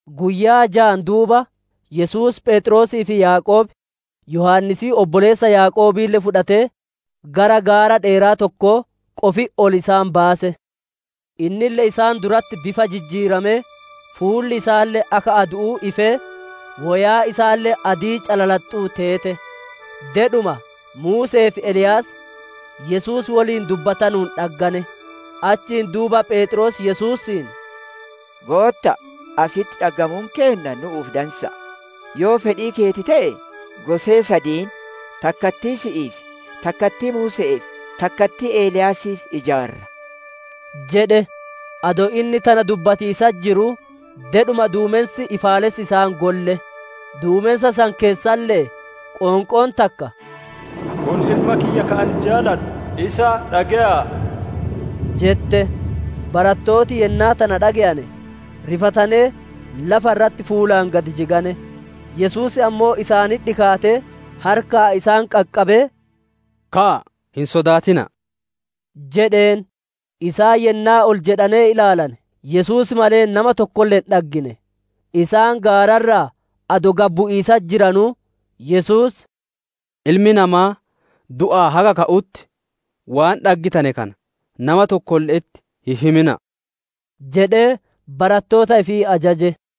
Guyyaa jaan duuba, Yesuus Pheexroosii fi Yaaqoob, Yohaannisii obboleessa Yaaqoobille fudhatee, gara gaara dheeraa tokkoo qofitti ol isaan baase. Innille isaan duratti bifa jijjiiramee, fuulli isaalle akka adu'uu ifee, woyaan isaalle adii calalaxxuu teete. Dedhuma Muuse'ee fi Eliyaas Yesuus woliin dubbatanuun dhaggane. Achiin duuba Pheexroos Yesuusiin, «Gootta'a, asitti dhaggamuun keenna nu'uuf dansa'a! Yoo fedhii keeti te'e, gosee sadiin, takkattii si'iif, takkattii Muuse'eef, takkattii Eliyaasiif ijaarraa» jedhe. Adoo inni tana dubbatiisatti jiruu, dedhuma duumensi ifaalessi isaan golle; duumensa san keessalle'ee qoonqoon takka, «Kun Ilma kiyya ka ani jaaladhu, isa dhage'a'a!» jette. Barattooti yennaa tana dhage'ane, rifatanee lafa irratti fuulaan gad jigane. Yesuus ammoo isaanitti dhikaatee harkaan isaan qaqqabee, «Ka'aa, hin sodaatina'a!» jedheen. Isaan yennaa ol jedhanee ilaalane, Yesuus malee nama tokkolle hin dhaggine. Isaan gaara irraa adoo gad bu'iisatti jiranuu, Yesuus, «Ilmi Namaa du'aa haga ka'utti waan dhaggittane kana nama tokkolle'etti hin himina'a» jedhee barattoota ifii ajaje.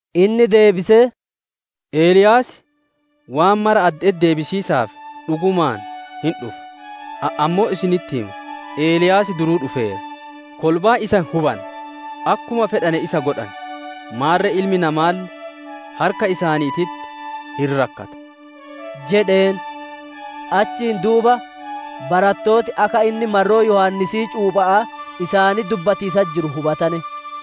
Inni deebisee, «Eliyaas waan mara adde'etti deebisiisaaf dhugumaan hin dhufa; Ani ammoo isinitti hima Eliyaas duruu dhufeera, kolbaan isa hin hubanne, akkuma fedhane isa godhane. Maarre Ilmi Namaalle harka isaaniititti hin rakkata» jedheen. Achiin duuba barattooti akka inni marroo Yohaannisii cuupha'aa isaanitti dubbatiisatti jiru hubatane.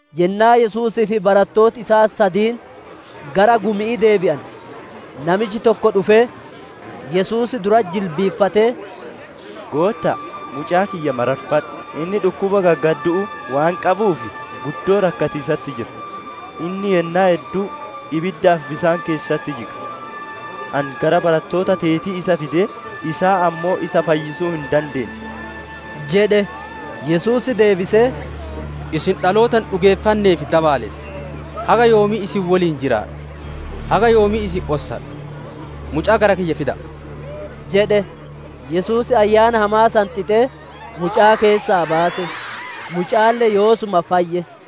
Yennaa Yesuusii fi barattooti isaa sadiin gara gumi'ii deebi'ane, namichi tokko dhufee, Yesuus duratti jilbiiffatee, «Gootta'a, mucaa kiyya mararfadhu, inni dhukkuba gaggaddu'uu waan qabuuf guddoo rakkatiisatti jira; inni yennaa hedduu ibiddaa fi bisaan keessatti jiga. Ani gara barattoota teetii isa fidee, isaan ammoo isa fayyisuu hin dandeenne» jedhe. Yesuus deebisee, «Isin dhaloota hin dhugeeffannee fi dabaalessa! Haga yoomii isin woliin jiraadha? Haga yoomii isin ossadha? Mucaa gara kiyya fida'a!» jedhe. Yesuus ayyaana hamaa san xixee, mucaa keessaa baase; mucaalle yoosuma fayye.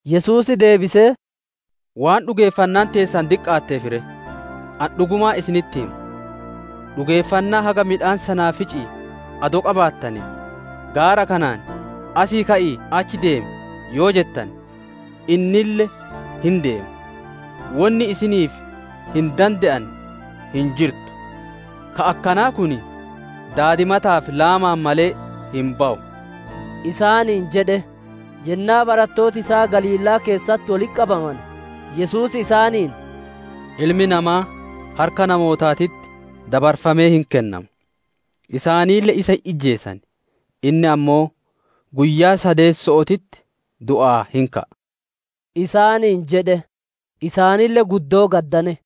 Yesuus deebisee, «Waan dhugeeffannaan teessan diqqaatteef re! Ani dhugumaan isinitti hima, dhugeeffannaa haga midhaan sanaafici'ii adoo qabaattanee, gaara kanaan, ‹Asii ka'ii achi deemi!› yoo jettane, innille hin deema; wonni isiniif hin dande'anne hin jirtu. [ Ka akkanaa kun daadimataa fi laamaan malee hin bawu» isaaniin jedhe.] Yennaa barattooti isaa Galiilaa keessatti wolitti qabamane, Yesuus isaaniin, «Ilmi Namaa harka namootaatitti dabarfamee hin kennama, isaanille isa hin ijjeesan, inni ammoo guyyaa sadeesso'ootitti du'aa hin ka'a» isaaniin jedhe. Isaanille guddoo gaddane.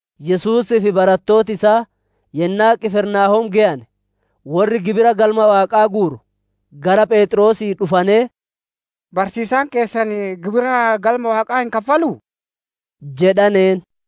Yesuusii fi barattooti isaa yennaa Qifirnaahoom geyane, worri gibira Galma Waaqaa guuru gara pheexroosii dhufanee, «Barsiisaan keessan gibira Galma Waaqaa hin kaffaluu?» jedhaneen.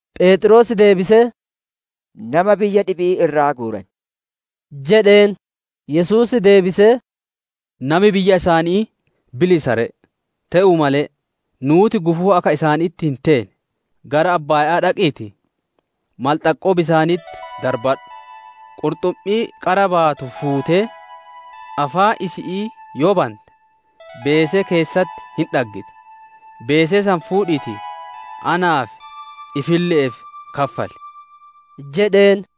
Pheexroos deebisee, «Nama biyya dhibi'ii irraa guuran» jedheen. Yesuus deebisee, «Nami biyya isaanii bilisa ree! Te'uu malee, nuuti gufuu akka isaanitti hin teene, gara abbaaya'aa dhaqiitii malxaqqoo bisaanitti darbadhu; qurxummii qara baatu fuutee, afaan isi'ii yoo bante, beesee keessatti hin dhaggita; beesee san fuudhiitii naaf, ifille'eef kaffali!» jedheen.